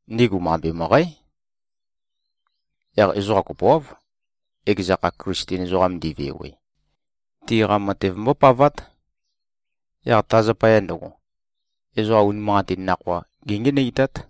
Ndigu mambe møqǽ. Yaq ezoqa kopoáv, ekeza kha Klisten ezoqam ndi꞉vewe, tiqa matev mbópavát. Yaq ta zapaya ndøgo, ezoqa unimanqatin nakhoa géngenøitát.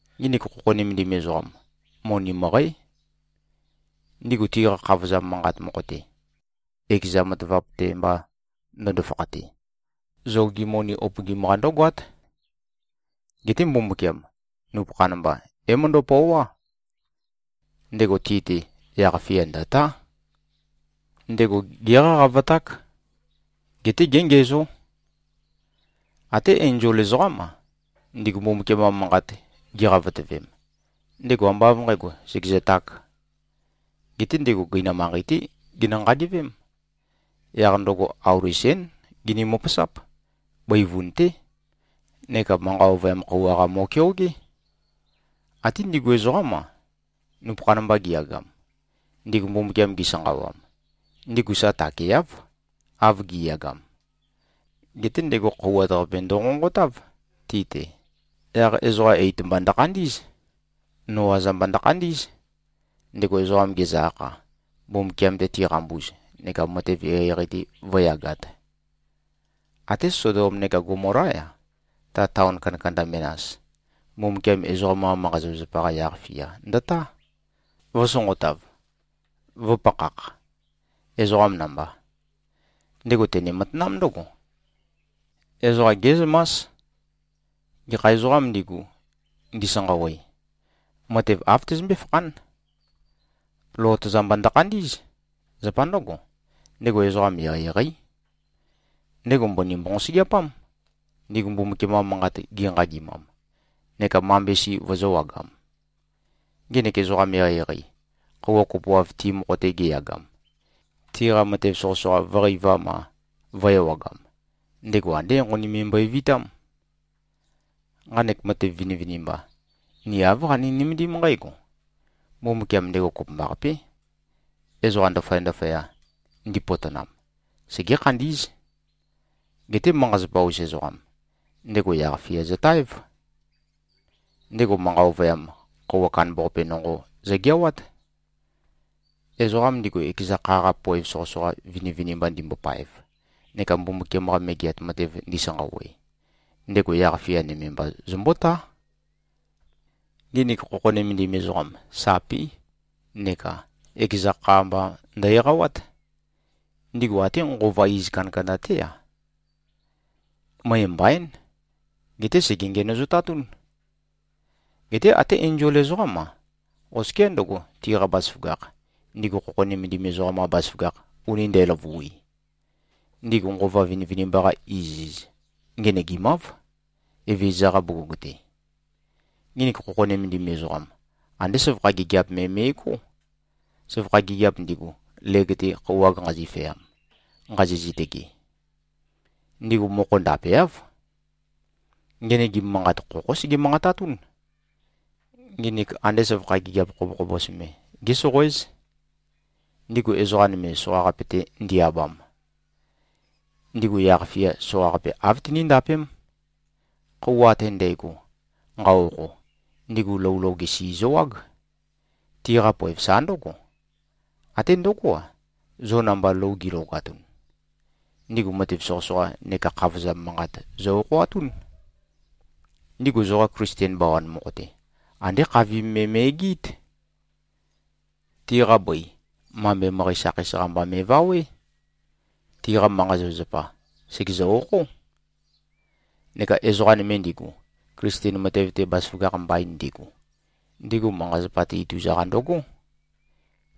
Nginik khokho nømendim ezoqam, moni møqǽ. Ndigu tiqa khavozam manqat mokho-te, ekeza matavap-te mba ndøndo-fakhate, zogi moni upøgim-qa ndǿgoát. Geté Mbumbukiam, nupøkhan mba, é-møndæpøoá. Ndego ti-te yaq-fia ndø̀tá. Ndego géqaqavaták. Geté géngiæzó. Até enzol ezoqám-a, ndigu Mbumbukiam-qa manqat giqavotøvem, ndego ambá av nqǣgo, sègezøtāk. Geté ndego gøinam manqei-té genø-nqagevém. Yaq ndøgo auli sén gini-møpøsáp. Bøivun-té. Neka manqa ovøyam khøuwa-qa mo꞉keogé. Até ndigu ezoqám-a, nupøkhan mba giyagam, ndigu Mbumbukiam gisanqawam, ndigu sa takeáv, av gi꞉yagam, geté ndego khøuwat-qape ndonqonqotáv, ti-te. Yaq ezoqa eit-mba ndøkhandí꞉z. Noa-za mba ndøkhandí꞉z, ndego ezoqa gezø-akha, Mbumbukiam-te tiqambuz neka matev eqeieqei-te vǿyagāt. Até Sodom neka Gomolá-ya, ta taon kandakanda menas, Mbumbukiam ezoqam-qa manqa-zapazapa-qa yaq-fia ndøtá, vø̄sonqotav, vø̄pakhak, ezoqam namba. Ndego tene-matanám ndǿgo: Ezoqa gé꞉zømás, gekha ezoqām ndigu, ndisanqawe, matev āv tøzømbé-fakhán. Lot-za mba ndøkhandí꞉z. Zapa ndǿgo, ndego ezoqam eqeieqeí. Ndego mbøni mbonqosøgeapám, ndigu Mbumbukiam-qa manqat ginqagimam, neka mambe si vøzø̄wagam. Ngenek ezoqam eqeieqei, khøuwa kopoav ti mokho-te geyagam, tiqa matev soqøsoqa vø̄qeivam-a, vø̄-ewagam, ndego andé enqoni me mbøevitám. Nqanek matev vinivinimba, ni āv qani-nømendím nqǽgo: Mbumbukiam ndego kopømbaqapé. Ezoqa ndaføya-ndaføya, ndipotonam, segé-khandí꞉z. Geté manqa-zapa-us ezoqam, ndego yaq-fia zøtaév. Ndego manqa ovøyam khøuwa kandambaqape nonqo zøgeawát. Ezoqam ndigu, ekeza kha-qa poev soqøsoqa vinivinimba ndimbopaev neka Mbumbukiam-qa Megeat Matev ndisanqawe, ndego yaq-fia nøme mba zømbótá. Nginik khokho nømendim ezoqam, sapí neka ekeza kha mba ndø-eqawát. Ndigu até nqova iz kandakanda-té-a, møe mbaín, geté sège-ngenøzotatún. Geté até enzol ezoqám-a, oskiá ndøgo, tiqa bazaføgakh, ndigu khokho nømendim ezoqam-qa bazaføgakh uni ndæløvui, ndigu nqova vinivinimba-qa iziz ngenøgimáv, Evezøza-qa bugug-te. Nginik khokho nømendim ezoqam, andé søvakha gigiap me me꞉gó, søvakha gigiap ndigu, leg-te khøuwag nqazifeam, nqazi-zitøge. Ndigu mokho ndàpeáv. Ngenøgim manqat khokhó sege-manqatatún. Nginik ande søvakha gigiap khobokhobos me, gésoqoéz. Ndigu ezoqa nøme, soqaqape-te ndi-abam, ndigu yaq-fia soqaqape āv tiníndapém. Khøuwa ate ndægo nqa-okho, ndigu lou loge si zøwág. Tiqa poev sa ndǿgo. Até ndøgó-a, zo namba lou gi꞉logatun, ndigu matev soqøsoqa neka khavozam manqat zø-okhoatún. Ndigu zoqa Klisten bawan mokho-te, andé khavim me me꞉gɨɨ́t. Tiqa bøi, mambe møqæ sakheis-qa mba me꞉vawé. Tiqa manqa-zapazapa, sègezø-okhó. Neka ezoqa nøme ndigu, Klisten matev-te bazaføgakh mbain ndigu, ndigu manqa-zapa-te ituza-qa ndøgó.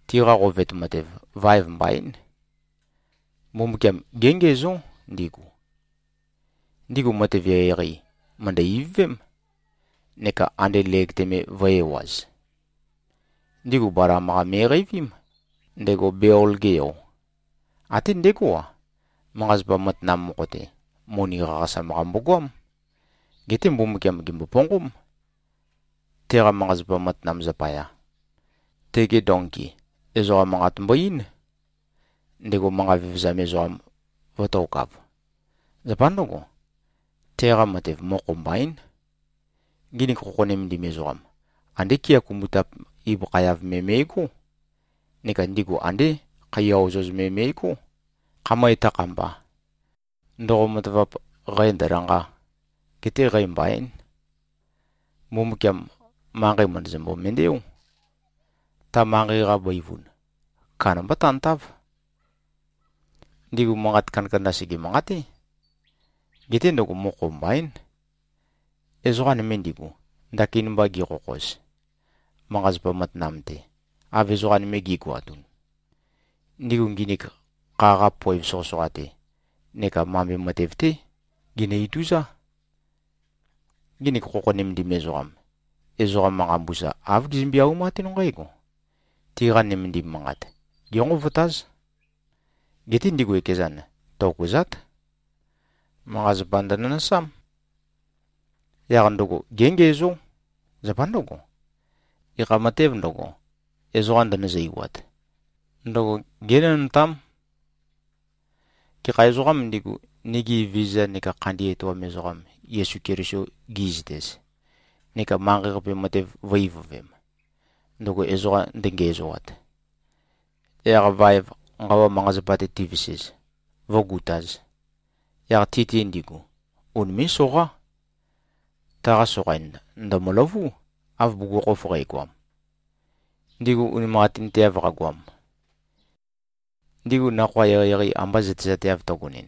Tiqa qovet matev, vaev mbaín. Mbumbukiam géngiæzó, ndigu. Ndigu matev eqeieqei, mø̀ndø-ivøvém, neka ande leg-te me vø̄e-ewaz. Ndigu Balam-qa me꞉qeivím, ndego Beol-ge yo. Até ndegó-a, manqa-zapa matanam mokho-te, moni qaqasam-qa mbogoám. Geté Mbumbukiam gèmboponqóm, teqa manqa-zapa matanam zapaya. Tege donki, ezoqa manqat mbo-eín, ndego manqa vevezam ezoqam vø̄tokav. Zapa ndǿgo, teqa matev mokho mbaín. Nginik khokho nømendim ezoqam, andé kea kumbutap ibøkha-yav me me꞉gó. Neka ndigu andé khaiya ozoz me me꞉gó, khamøe tøkhamba, ndoqo-matavap, qæ ndø̄lanqā, getē qæ mbaīn. Mbumbukiam manqei mø̀ndøzømbo-mendeó. Ta manqei-qa bøivun, kandamba tantáv. Ndigu manqat kandakanda, sège-manqaté. Geté ndøgo mokho mbaín. Ezoqa nøme ndigu, ndakin mba gikhokhoz, manqa-zapa matanam-te, av ezoqa nøme gi꞉goatun, ndigu nginik kha-qa poev soqøsoqa-te neka mambe matev-té ginø-ituzá. Nginik khokho nømendim ezoqam, ezoqa manqa mbusa āv gizømbe-aumatún nqǽgo: Tiqa nømendim manqat, génqovotáz. Geté ndigu ekezan, tokøzát. Manqa-zapa ndønønøsám. Yaq ndøgo géngiæzó. Zapa ndǿgo, gekha matēv ndøgo, ezoqa ndønøzøiwat, ndøgo génønøtám. Gekha ezoqām ndigu, nigi Evezøza neka Khandi Etoam Ezoqam Yesu Keliso gi꞉zøtez, neka manqei-qape matev vø̄-ivøvem, ndøgo ezoqa ndøngiæzoat, yaq vaev nqawa manqa-zapa-te tivesez, vǿgutāz, yaq ti-te ndigu unimé꞉-soqá. Taqa soqain ndø̀møløvú, av bugukhokhof qægoam, ndigu unimanqatinteav qagoam. Ndigu nakhoa eqeieqei amba zøtezateav tøgonɨn,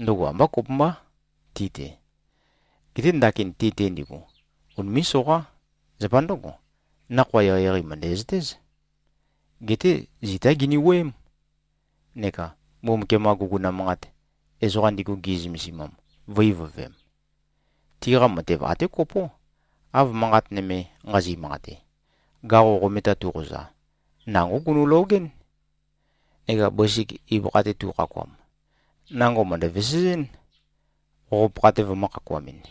ndøgo ambá kopømbá ti-te. Geté ndakin ti-te ndigu, unimé꞉-soqá. Zapa ndǿgo, nakhoa eqeieqei mø̀ndæzøtéz. Geté zitá gini-wuøém, neka Mbumbukiam-qa guguna manqat, ezoqa ndigu gi꞉zømesimam, vø̄-ivøvem. Tiqa matev até kopó, av manqat nøme, nqazi-manqate. “Gaqo qometa tuqoza, nangó gunølogɨ́n,” neka “Bøsik ibøkha-te tukhakuam, nango mø̀ndø-vesezɨn, qoq-pakha-te vømø̄-khakuamɨn.”